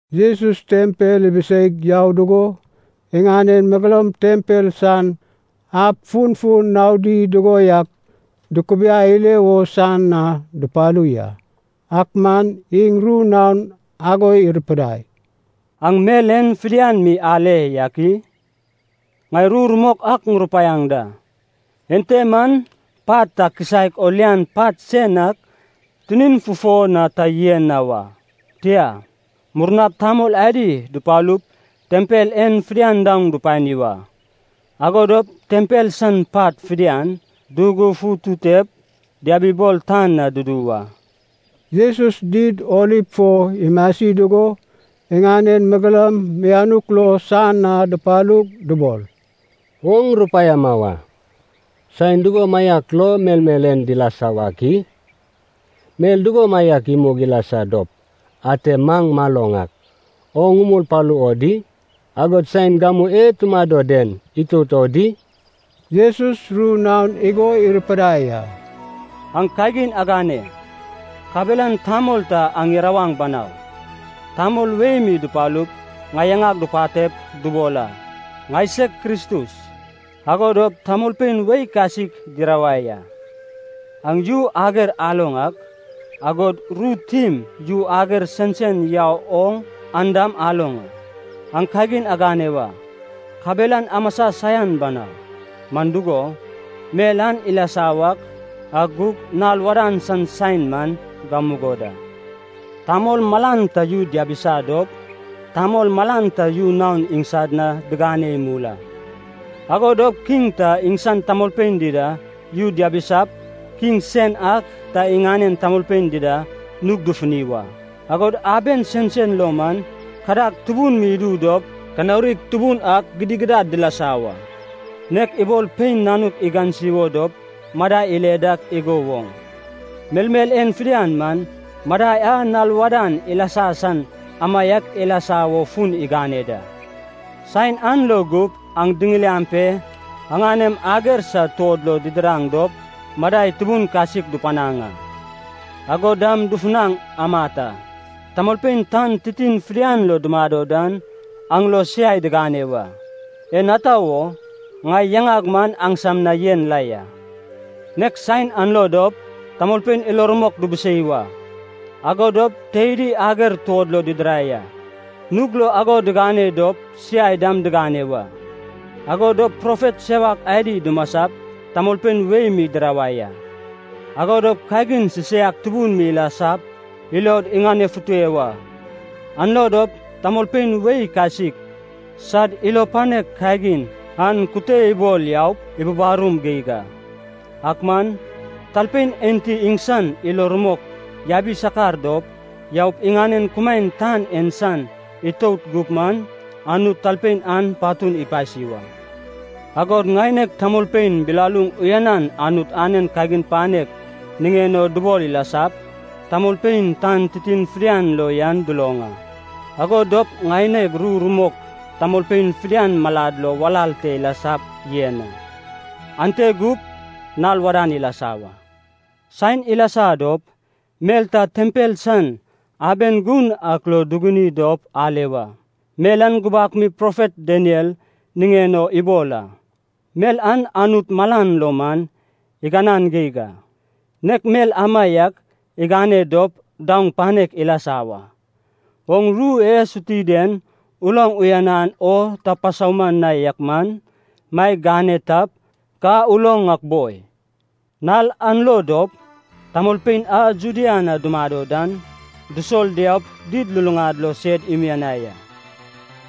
Jesus tempel ibiseig yau dugo, iŋanen megeloum tempel san ab funfun naodi dugo yak dukubiai ile wo san na dupalu ya. Ak man iŋ ru naon ago irupidai, “Aŋ mel en fidian mi ale yak i? Ŋai ru rumok ak ŋurupaiaŋ da, ente man pat ta kisaek o lian pat sen ak tinin fufo na ta yen na wa. Tia, murnap tamol adi dupalup tempel en fidian daoŋ dupani wa, ago dop tempel san pat fidian dugufututep diabibol tan na dudu wa.” Jesus Did Oliv fo imasi dugo iŋanen megeloum mianuk lo san na dupalug dubol, “Oŋ rupaiama wa, saen dugomaiak lo melmel en dilasa wak i? Mel dugomaiak imug ilasa dop, ate maŋ maloŋ ak, oŋ umul palu o di? Agod saen gamu e tumado den itout o di?” Jesus ru naon igo irupidai a, “Aŋ kagin agane, kabelan tamol ta aŋ irawaŋ banau. Tamol wei mi dupalup ŋai yaŋag dupatep dubol a, ‘Ŋaiseg Kristus.’ Ago dop tamolpein wei kasik dirawai a. Aŋ yu ager aloŋ ak, agod ru tim yu ager sensen yau oŋ an dam aloŋ a. Aŋ kagin agane wa, kabelan amasa saian banau, man dugo, mel an ilasa wak, ak gug nal wadan san saen man gamugo da. Tamol malan ta yu diabisa dop, tamol malan ta yu naon iŋsad na digane imul a. Ago dop kiŋ ta iŋsan tamolpein dida yu diabisap, kiŋ sen ak ta iŋanen tamolpein dida nug dufuni wa. Agod aben sensen lo man kadag tubun mi idu dop kanaurig tubun ak gidigidad dilasa wa. Nek ibol pein nanuk igansi wo dop madai ile dak igo woŋ, melmel en fidian man, madai a nal wadan ilasa san amaiak ilasa wo fun igane da. “Saen an lo gup aŋ diŋiliaŋ pe aŋanem ager sad tuod lo didiraŋ dop madai tubun kasik dupanaŋ a, agod dam dufunaŋ amat a. Tamolpein tan titin fidian lo dumado dan aŋ lo siai digane wa. En ata wo? Ŋai yaŋag man aŋsam na yen la ya. Nek saen an lo dop, tamolpein ilo rumok dubusei wa, ago dop teidi ager tuod lo didirai a. Nug lo ago digane dop siai dam digane wa. Ago dop profet sewak adi dumasap tamolpein wei mi dirawai a. Ago dop kagin sisaiak tubun mi ilasap ilod iŋanefute wa, an lo dop tamolpein wei kasik sad ilo panek kagin an kute ibol yaup ibubarum geig a. Ak man, talpein enti iŋsan ilo rumok yabi sakar dop, yaup iŋanen kumaen tan en san itout gup man, Anut talpein an patun ipasi wa. Agod ŋaineg tamolpein bilaluŋ uyanan Anut anen kagin panek niŋen o dubol ilasap, tamolpein tan titin fidian lo yan duloŋ a. Ago dop ŋaineg ru rumok tamolpein fidian malad lo walal te ilasap yen a. Ante gup, nal wadan ilasa wa. “Saen ilasa dop, mel ta tempel san aben gun ak lo duguni dop ale wa. Mel an gubak mi profet Daniel niŋen o ibol a. Mel an Anut malan lo man iganan geig a, nek mel amaiak igane dop daoŋ panek ilasa wa. (Oŋ ru e suti den uloŋ uyan o ta pasauman na yak man, maeg gane tap ka uloŋ ak boi.) Nal an lo dop, tamolpein a Judea na dumado dan, dusol diaup did luluŋad lo sed imianai a.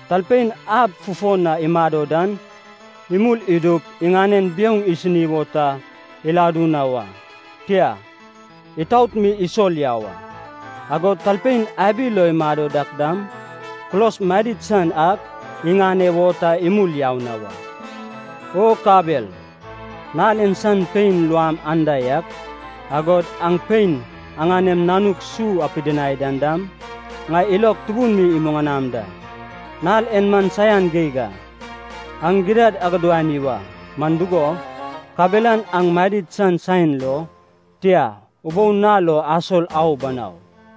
Talpein ab fufo na imado dan, imul idup iŋanen biouŋ isini wo ta iladu na wa, tia, itaot mi isol yau a. Agod talpein abi lo imado dak dam, kulos madid san ak iŋane wo ta imul yau na wa. O kabel, nal en san pein luam anda yak, agod aŋ pein aŋanem nanuk su apidinai dan dam, ŋai ilog tubun mi imuŋanaŋ da! Nal en man saian geig a. Aŋ gidad agudani wa, man dugo, kabelan aŋ madid san saen lo, tia, ubou nal lo asol au banau.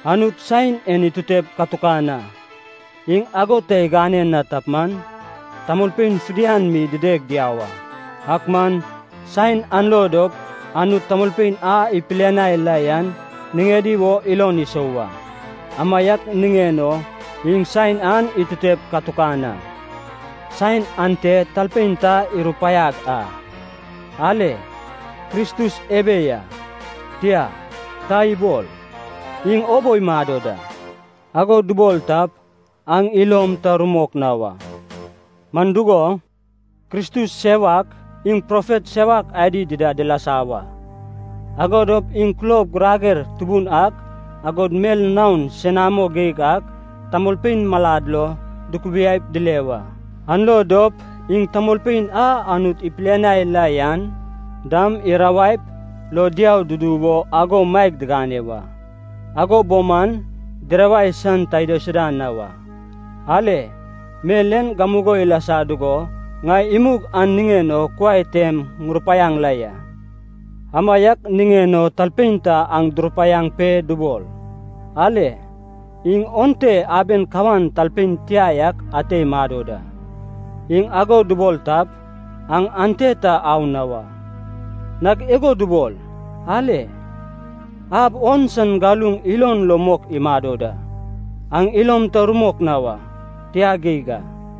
Anut saen en itutep katukan a, iŋ ago ta igane na tap man, tamolpein fidian mi dideg diau a. Ak man, saen an lo dop Anut tamolpein a ipilianai la yan niŋedi wo ilon isou wa. Amaiak niŋen o iŋ saen an itutep katukan a. Saen ante talpein ta irupaiaŋ a, ‘Ale, Kristus ebe ya!’ Tia, ta ibol, ‘Iŋ obo imado da!’ Ago dubol tap, aŋ ilom ta rumok na wa. Man dugo, kristus sewak, iŋ profet sewak adi dida dilasa wa, ago dop iŋ kulob girager tubun ak, agod mel naon senamo geig ak tamolpein malad lo dukubiaip dile wa. An lo dop iŋ tamolpein a Anut ipilianai la yan dam dirawaip lo diau dudu wo ago maeg digane wa. Ago bo man dirawai san ta idaisuda na wa. Ale, mel en gamugo ilasa dugo ŋai imug an niŋen o kuai tem ŋurupaiaŋ la ya. “Amaiak niŋen o talpein ta aŋ durupaiaŋ pe dubol, ‘Ale, iŋ onte aben kawan talpein tia yak ate imado da!’ Iŋ ago dubol tap, aŋ ante ta au na wa. Nag igo dubol, ‘Ale, ab on san galuŋ ilon lo mok imado da!’ Aŋ ilom ta rumok na wa. Tia geig a.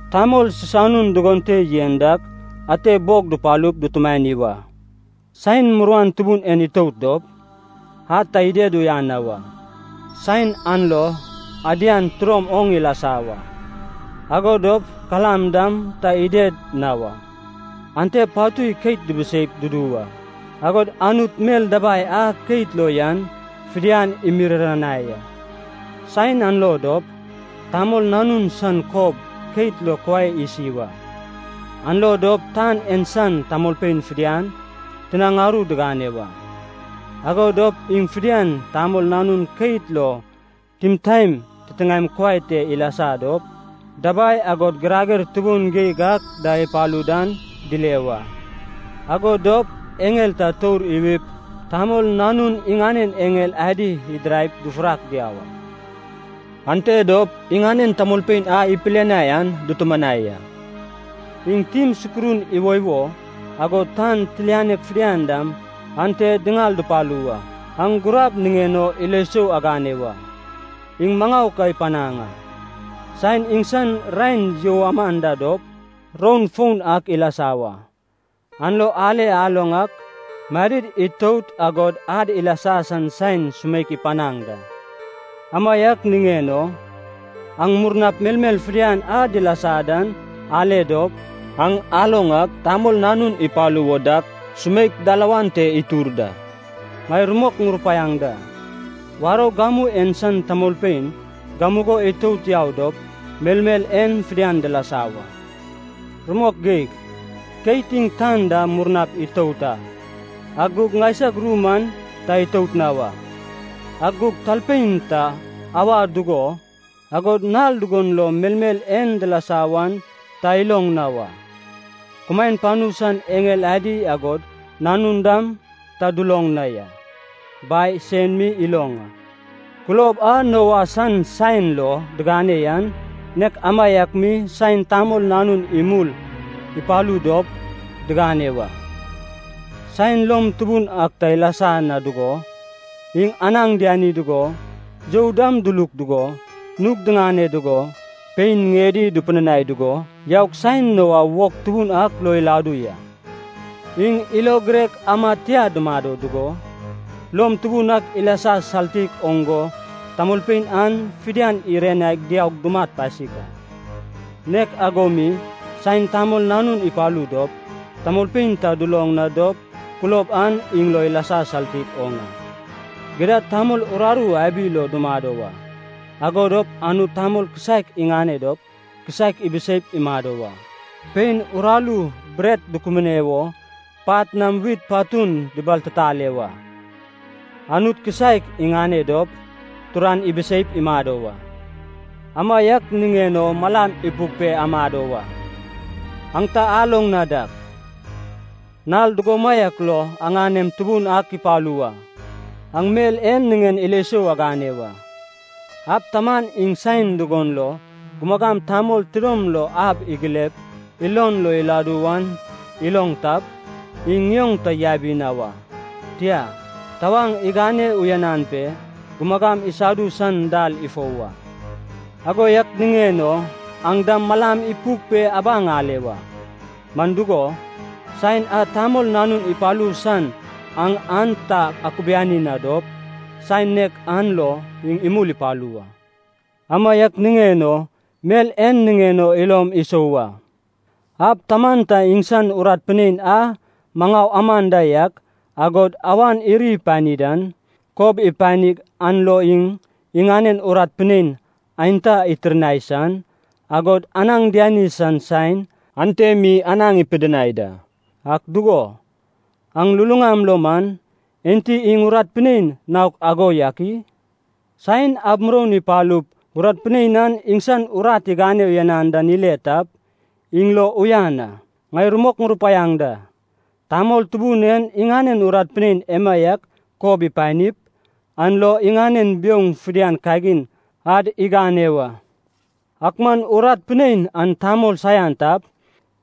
Tamol sisanun dugon te yen dak ate bog dupalup dutumani wa. “Saen muruan tubun en itout dop, ad ta ided uyan na wa. Saen an lo ‘adian tidom oŋ ilasa wa, ago dop kalam dam ta ided na wa. Ante patui keit dibiseip dudu wa, agod Anut mel dabai a keit lo yan fidian imiriranai a.’ “Saen an lo dop, Tamol Nanun san kob keit lo kuai isi wa, an lo dop tan en san tamolpein fidian tinaŋ aru digane wa. Ago dop iŋ fidian Tamol Nanun keit lo timtaen titiŋaem kuai te ilasa dop, dabai agod girager tubun geig ak da ipalu dan, dile wa. Ago dop eŋel ta tour iwip Tamol Nanun iŋanen eŋel adi idiraip dufurak diau a. Ante dop iŋanen tamolpein a ipilianai an dutumanai a. Iŋ tim sukurun iwoiwo, agod tan tilianek fidian dam ante diŋal dupalu wa. “Aŋ gurab niŋen o ilo sou agane wa, iŋ maŋau ka ipanaŋ a. Saen iŋsan raen you aman da dop, roun foun ak ilasa wa. An lo ale aloŋ ak madid itout agod ad ilasa san saen sumeikan ipanaŋ da. Amaiak niŋen o, aŋ murnap melmel fidian a dilasa dan ale dop, aŋ aloŋ ak Tamol Nanun ipalu wo dak, sumeik dalawan te itur da. Ŋai rumok ŋurupaiaŋ da, warou gamu en san tamolpein gamugo itout yau dop melmel en fidian dilasa wa. Rumok geig, keit iŋ tan da murnap itout a, ak gug ŋaisag ru man ta itout na wa. “Ak gug talpein ta auwa dugo, agod nal dugon lo melmel en dilasa wan ta iloŋ na wa. Kumaen panu san eŋel adi agod Nanun dam ta duloŋ na ya. Bai sen mi iloŋ a. Kulob a Noa san saen lo digane yan, nek amaiak mi saen Tamol Nanun imul ipalu dop digane wa. Saen lom tubun ak ta ilasa na dugo, iŋ anaŋ diani dugo, you dam duluk dugo, nug diŋane dugo, pein ŋiedi dupidinai dugo, yaug saen Noa wog tubun ak lo iladu ya. Iŋ ilo girek amad tia dumado dugo, lom tubun ak ilasa saltik oŋ go tamolpein an fidian irianai diaug dumat pasik a. Nek ago mi, saen Tamol Nanun ipalu dop, tamolpein ta duloŋ na dop kulob an iŋ lo ilasa saltik oŋ a. Gidad tamol uraru abi lo dumado wa. Ago dop Anut tamol kisaek iŋane dop, kisaek ibiseip imado wa. Pein uraru bret dukubune wo pat nam wit patun dibaltitale wa. Anut kisaek iŋane dop, turan ibiseip imado wa. Amaiak niŋen o malam ipuk pe amado wa. Aŋ ta aloŋ na dak, nal dugomaiak lo aŋanem Tubun ak ipalu wa. Aŋ mel en niŋen ilo sou agane wa. Ab taman iŋ saen dugon lo gumagam tamol tidom lo ab igilep ilon lo iladu wan iloŋ tap, iŋ ŋioŋ ta yabi na wa. Tia, tawaŋ igane uyanan pe gumugam isadu san dal ifou wa. Ago yak niŋen o aŋ dam malam ipuk pe abaŋ ale wa. Man dugo, saen a Tamol Nanun ipalu san aŋ an ta akubiani na dop, saen nek an lo iŋ imul ipalu wa. “Amaiak niŋen o mel en niŋen o ilom isou wa. Ab taman ta iŋsan urat pinein a maŋau aman da yak, agod awan iri ipani dan, kob ipanig an lo iŋ iŋanen urat pinein aenta itirnai san, agod anaŋ diani san saen ante mi anaŋ ipidinai da. Ak dugo, aŋ luluŋam lo man, enti iŋ urat pinein naok ago yak i? Saen ab muroun ipalup urat pinein an iŋsan urat igane uyanan dan ile tap, iŋ lo uyan a. Ŋai rumok ŋurupaiaŋ da. Tamol tubun en iŋanen urat pinein emaiak kob ipanip, an lo iŋanen biouŋ fidian kagin ad igane wa. Ak man urat pinein an tamol saian tap,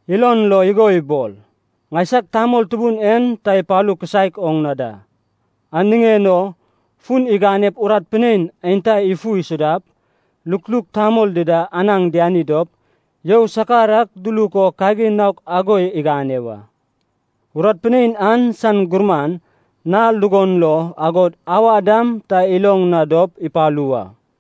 ilon lo igo ibol, ‘Ŋaisag tamol tubun en ta ipalu kisaek oŋ na da.’ An niŋen o fun iganep urat pinein aenta ifu isudap, lukluk tamol dida anaŋ diani dop, you sakar ak duluk o kagin naok ago igane wa. Urat pinein an san gurman, nal dugon lo, agod auwa dam ta iloŋ na dop ipalu wa.